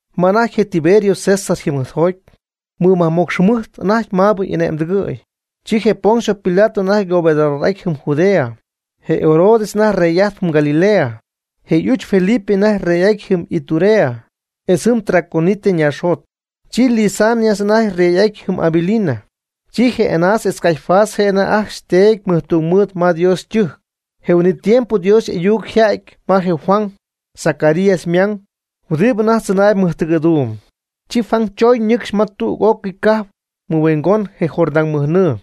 Ma anajty je Tiberio César yjɨmɨjtjoty, mɨmajmocx jɨmɨjt anajty maabɨ y'ane'mtɨgɨ̈y, chi je Poncio Pilato anajty gobernador'ajtp jɨm Judea, je Herodes anajty rey'ajtp jɨm Galilea, je' y'uch Felipe anajty rey'ajtp jɨm Iturea etz jɨm Traconite ñaaxjot. Chi Lisanias anajty rey'ajtp jɨm Abilina. Chi je Anás etz Caifás je' ajcxy anajty teedy mɨjtungmɨɨd ma Dios ytɨjc. Je huin'it tiempo Dios y'ayuc yja'ty ma je Juan, Zacarías ymang, huɨdibɨ anajty tzɨnaayb mɨjtɨgɨ̈duum. Chi Juan choñ ñɨcxy ma tüg'ócɨy cajp mɨhuingon je Jordán mɨjnɨɨ,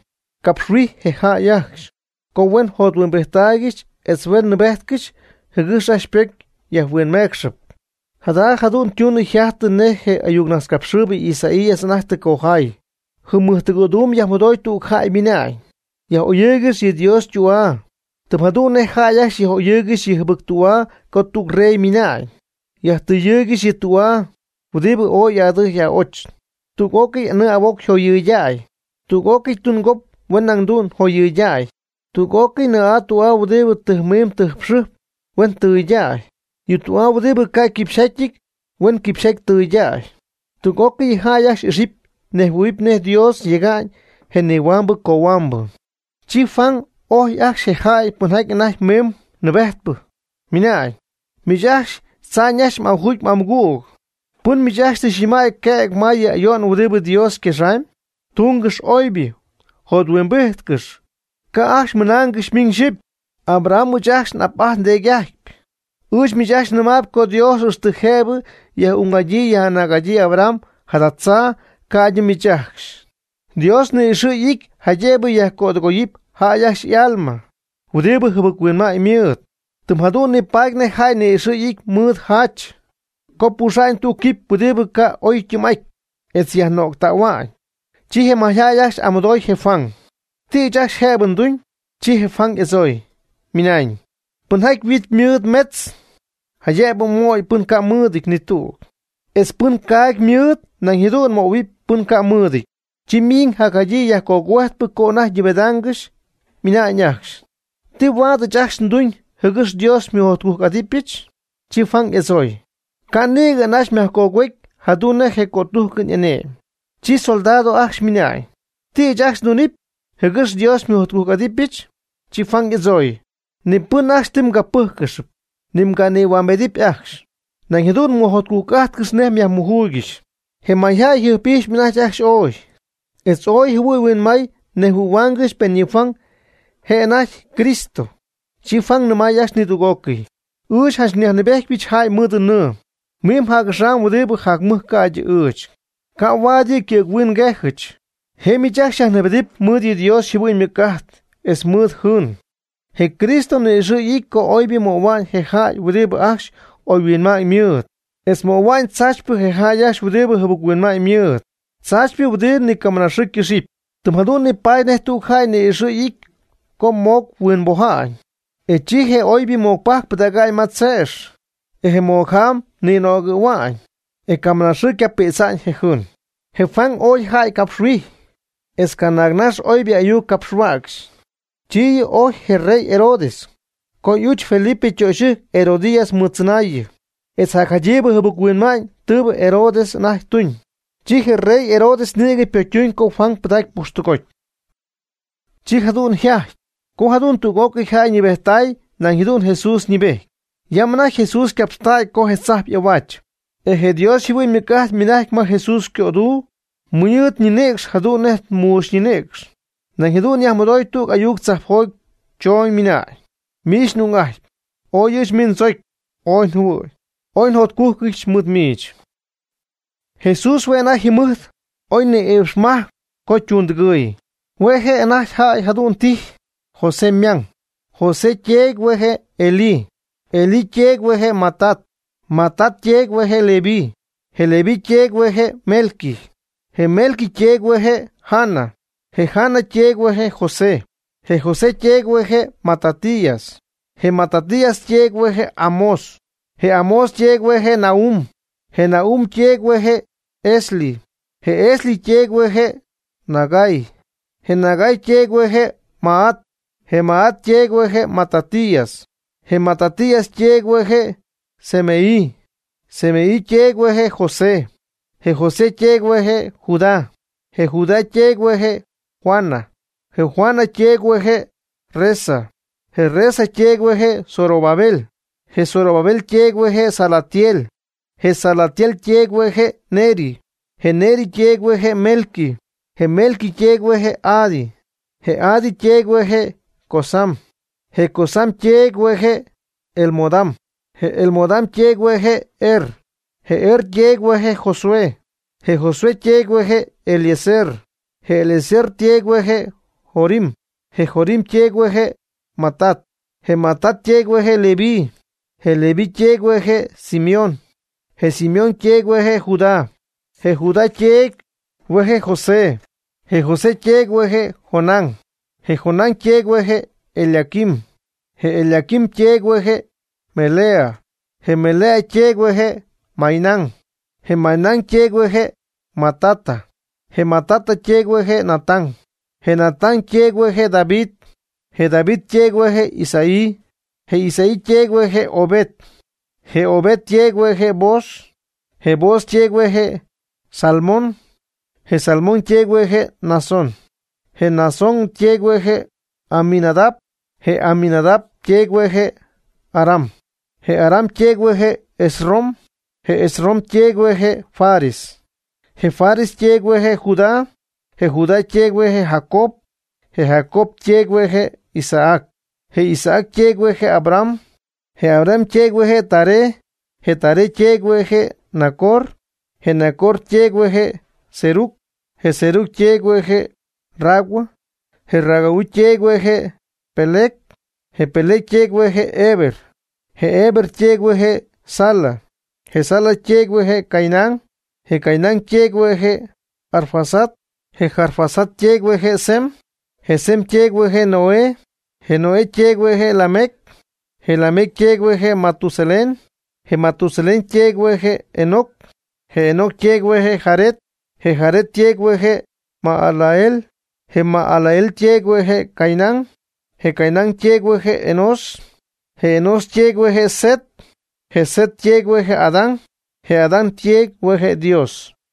capxhuijy je jäy ajcxy, co huen jothuimbijttaaygɨxy etz huen nɨɨbejtcɨxy jɨgɨx ajcxy ypocy yajhuinmeecxɨp. Jada jadu'n tunɨ jajtɨ nej je ayucnajtzcapxɨɨybɨ Isaías anajty tɨ cojaay: Jɨm mɨjtɨgɨ̈duum yajmɨdooy tüg jäy mɨna'ñ: “Yaj'oyɨɨygɨx yɨ Dios ytü'aa, tɨm jadu'n nej jäy ajcxy yaj'oyɨɨygɨxy yɨ jɨbɨc tü'aa co tüg rey mina'ñ.” Yajtɨ́ɨyɨgɨxy yɨ tü'aa huidɨbɨ ooy y'adɨjy y'a'och. Tüg'ócɨy anɨɨ ahuoc huen joyɨɨydäy, tüg'ócɨy tungop huen nañ jadu'n joyɨɨydäy. Tüg'ócɨy nɨɨ'aa tü'aa huɨdibɨ tɨjmin tɨjxɨjp huen tɨɨydäy. Yɨ tü'aa huɨdibɨ ca' quipxyjátyɨty huen quipxyjaty tɨɨydäy. Tüg'ócɨy yɨ jäy ajcxy ixɨpy ñejhuɨ̈hɨpy nej Dios yega'ñ je nihuambɨ cohuambɨ. Chi Juan ojy ajcxy je jäy pɨnjaty anajty miimb nɨɨbejtpɨ, ymɨnañ: ―¡Miich ajcxy tza'ñ ajcxy y'ajugy y'amɨgüg! ¿Pɨn miich ajcxy tɨ xynɨmäy quëg ma yɨ ayo'n huɨdibɨ Dios yquexaamy? Túngɨx oybɨ, jothuimbíjtcɨx, ca' ajcxy mɨnaangɨxy miñ xyipy: “Abraham ɨɨch ajcxy n'ap'ajtpy ndeedy'ajtpy”. Ɨɨch miich ajcxy nɨmaayb co Dios ixtɨ jëbɨ yɨ' yaj'ung'adyii yaj'anäg'adyii Abraham jada tzaa ca'ydɨ miich ajcxy. Dios ni'ixɨ̈ y'ity jaydëbɨ yajcödɨgoyɨpy jäy ajcxy y'alma huɨdibɨ jɨbɨc-huinma'ñ mɨɨd. Tɨm jadu'n nipaady nej jäy ni'ixɨ̈ y'ity mɨɨd jacha co pujxɨ̈ga'ñ tüg quipy huɨdi ca' oy ytɨɨm'aty, etz yajnögtähua'ñ. Chi je mayjäy ajcxy y'amɨdooy je Juan: ―¿Ti ɨɨch ajcxy jëbɨ nduñ? Chi je Juan y'adzooy, ymɨnañ: ―Pɨnjaty yhuit mɨɨd metz, jaydëbɨ möy pɨn ca' mɨɨdɨty ni tüg. Etz pɨnjaty caagy mɨɨd nañ jadu'n möhuɨpy pɨnjaty ca' mɨɨdɨty. Chi miiñ jadyii yajcogüejtpɨ co anajty ñɨɨbedaangɨxy, ymɨnañ ajcxy: ―¿Ti huaad ɨɨch ajcxy nduñ (jɨgɨx Dios xymɨjotcujc'adɨpyɨch)? Chi Juan y'adzooy: ―Ca' nɨ̈gɨ anaxy myajcogüety jadu'n nej je cötújcɨn y'ane'my. Chi soldado ajcxy ymɨnañ: ―¿Ti ɨɨch ajcxy ndunɨpy (jɨgɨx Dios xymɨjotcujc'adɨpyɨch)? Chi Juan y'adzooy: ―Ni pɨn ajcxy ti mgapɨ́jcɨpy, ni mganïhuambedɨpy ajcxy. Nañ jadu'n mɨjotcujc'ájtcɨxy nej myajmujuuygɨxy. Je mayjäy yjɨjp'ijxyp anajty ajcxy ooy, etz ooy jɨhuɨɨy huinmaay nejhuɨ̈huaangɨxy pen yɨ Juan je' anajty Cristo. Chi Juan nɨmay ajcxy nidüg'ócɨy: ―Ɨɨch janch nyajnɨɨbéjtypɨch jäy mɨɨd nɨɨ. Miimb je' axaam huɨdibɨ jacmɨj ca'ydɨ ɨɨch, ca' huaad yɨ' ycɨ̈ghuin ngejɨch. Je' miich ajcxy xyajnɨɨbedɨpy mɨɨdɨ Dios yjɨhuɨ'ñ ymɨc'ajt etz mɨɨdɨ jɨɨn. Je Cristo ni'ixɨ' y'ity co oybɨ möhua'ñ je jäy huɨdibɨ ajcxy oyhuinma'ñ mɨɨd, etz ymöhuaamy tzaachypɨ je jäy ajcxy huɨdibɨ jɨbɨc-huinma'ñ mɨɨd, tzaachypɨ huɨdibɨ nicamɨna ycɨxɨpy. Tɨm jadu'n nipaady nej tüg jäy ni'ixɨ' y'ity co ymoc-huimboja'n, e chi je oybɨ mocpajc pɨdäga'ñ ma che'x, etz je mocjaam ninögɨ̈hua'ñ, e camɨnaxɨɨ ycapïdza'ñ je jɨɨn. Je Juan ooy jäy capxhuijy, etz canaagnax oybɨ ayuc capxhuäcxy. Chi yɨ' ojy je rey Herodes, co y'uch Felipe ytöxyɨjc Herodías mɨɨd tzɨnaayɨ, etz jacjaydiiybɨ jɨbɨc-huinma'ñ tɨɨbɨ Herodes anajty tuñ. Chi je rey Herodes nïgɨ pocytuñ co Juan pɨdacy pujxtɨgoty. Chi jadu'n yjajty co jadu'n tüg'ócɨy jäy ñɨɨbejttay nañ jadu'n Jesús ñɨɨbejty. Yam anajty Jesús ycapxtägy co je tzajp y'ahuaach, etz je Dios yjɨhuɨ'ñ ymɨc'ajt ymɨnajcy ma Jesús ycöduu mɨɨd ñinïcx jadu'n nej muuxy ñinïcx. Nañ jadu'n yajmɨdoy tüg ayuc choñ tzajpjoty ymɨnañ: ―Miich n'ung'ajtpy, ooy ɨɨch miich ndzocy ooy njɨhuɨ̈y, ooy njotcújcɨdyɨch mɨɨd miich. Jesús hue' anajty yjɨmɨjt oy ni iipxmajc co ytungtɨgɨɨy. Hue' je' anajty jadu'n jäy tijy José ymang, José yteedy hue' je' Elí, Elí yteedy hue' je' Matat, Matat yteedy hue' je' Leví, je Leví yteedy hue' je' Melqui, je Melqui yteedy hue' je' Jana, je Jana yteedy hue' je' José, Je José yteedy hue' je' Matatías, je Matatías yteedy hue' je' Amós, je Amós yteedy hue' je' Nahum, je Nahum yteedy hue' je' Esli, je Esli yteedy hue' je' Nagai, je Nagai yteedy hue' je' Maat, je Maat yteedy hue' je' Matatías, je Matatías yteedy hue' je' Semei, je Semei yteedy hue' je' José, je José yteedy hue' je' Judá, je Judá yteedy hue' je' Joana, je Joana yteedy hue' je' Resa, je Resa yteedy hue' je' Zorobabel, je Zorobabel yteedy hue' je' Salatiel, je Salatiel yteedy hue' je' Neri, je Neri yteedy hue' je' Melqui, je Melqui yteedy hue' je'Adi, je Adi yteedy hue' je' Cosam, je Cosam yteedy hue' je' Elmodam, je Elmodam yteedy hue' je' Er, je Er yteedy hue' je' Josué, je Josué yteedy hue' je'Eliezer, je Eliezer yteedy hue' je' Jorim, je Jorim yteedy hue' je' Matat, je Matat yteedy hue' je' Leví, je Leví yteedy hue' je' Simeón, je Simeón yteedy hue' je' Judá, je Judá yteedy hue' je' José, je José yteedy hue' je' Jonán, je Jonán yteedy hue' je' Eliaquim, je Eliaquim yteedy hue' je' Melea, je Melea yteedy hue' je' Mainán, je Mainán yteedy hue' je' Matata, je Matata yteedy hue' je' Natán, je Natán yteedy hue' je' David, je David yteedy hue' je' Isaí, je Isaí yteedy hue' je' Obed, je Obed yteedy hue' je' Booz, je Booz yteedy hue' je' Salmón, je Salmón yteedy hue' je' Naasón, je Naasón yteedy hue' je' Aminadab, je Aminadab yteedy hue' je' Aram, je Aram yteedy hue' je' Esrom, je Esrom yteedy hue' je' Fares, je Fares yteedy hue' je' Judá, je Judá yteedy hue' je' Jacob, je Jacob yteedy hue' je' Isaac, je Isaac yteedy hue' je' Abraham, je Abraham yteedy hue' je' Taré, je Taré yteedy hue' je' Nacor, je Nacor yteedy hue' je' Serug, je Serug yteedy hue' je' Ragau, je Ragau yteedy hue' je' Peleg, je Peleg yteedy hue' je' Heber, je Heber yteedy hue' je' Sala, je Sala yteedy hue' je' Cainán, je Cainán yteedy hue' je' Arfaxad, je Arfaxad yteedy hue' je' Sem, je Sem yteedy hue' je' Noé, je Noé yteedy hue' je' Lamec, je Lamec yteedy hue' je' Matusalén, je Matusalén yteedy hue' je' Enoc, je Enoc yteedy hue' je' Jared, je Jared yteedy hue' je' Mahalaleel, je Mahalaleel yteedy hue' je' Cainán, je Cainán yteedy hue' je' Enós, je Enós yteedy hue' je' Set, je Set yteedy hue' je' Adán, je Adán yteedy hue' je' Dios.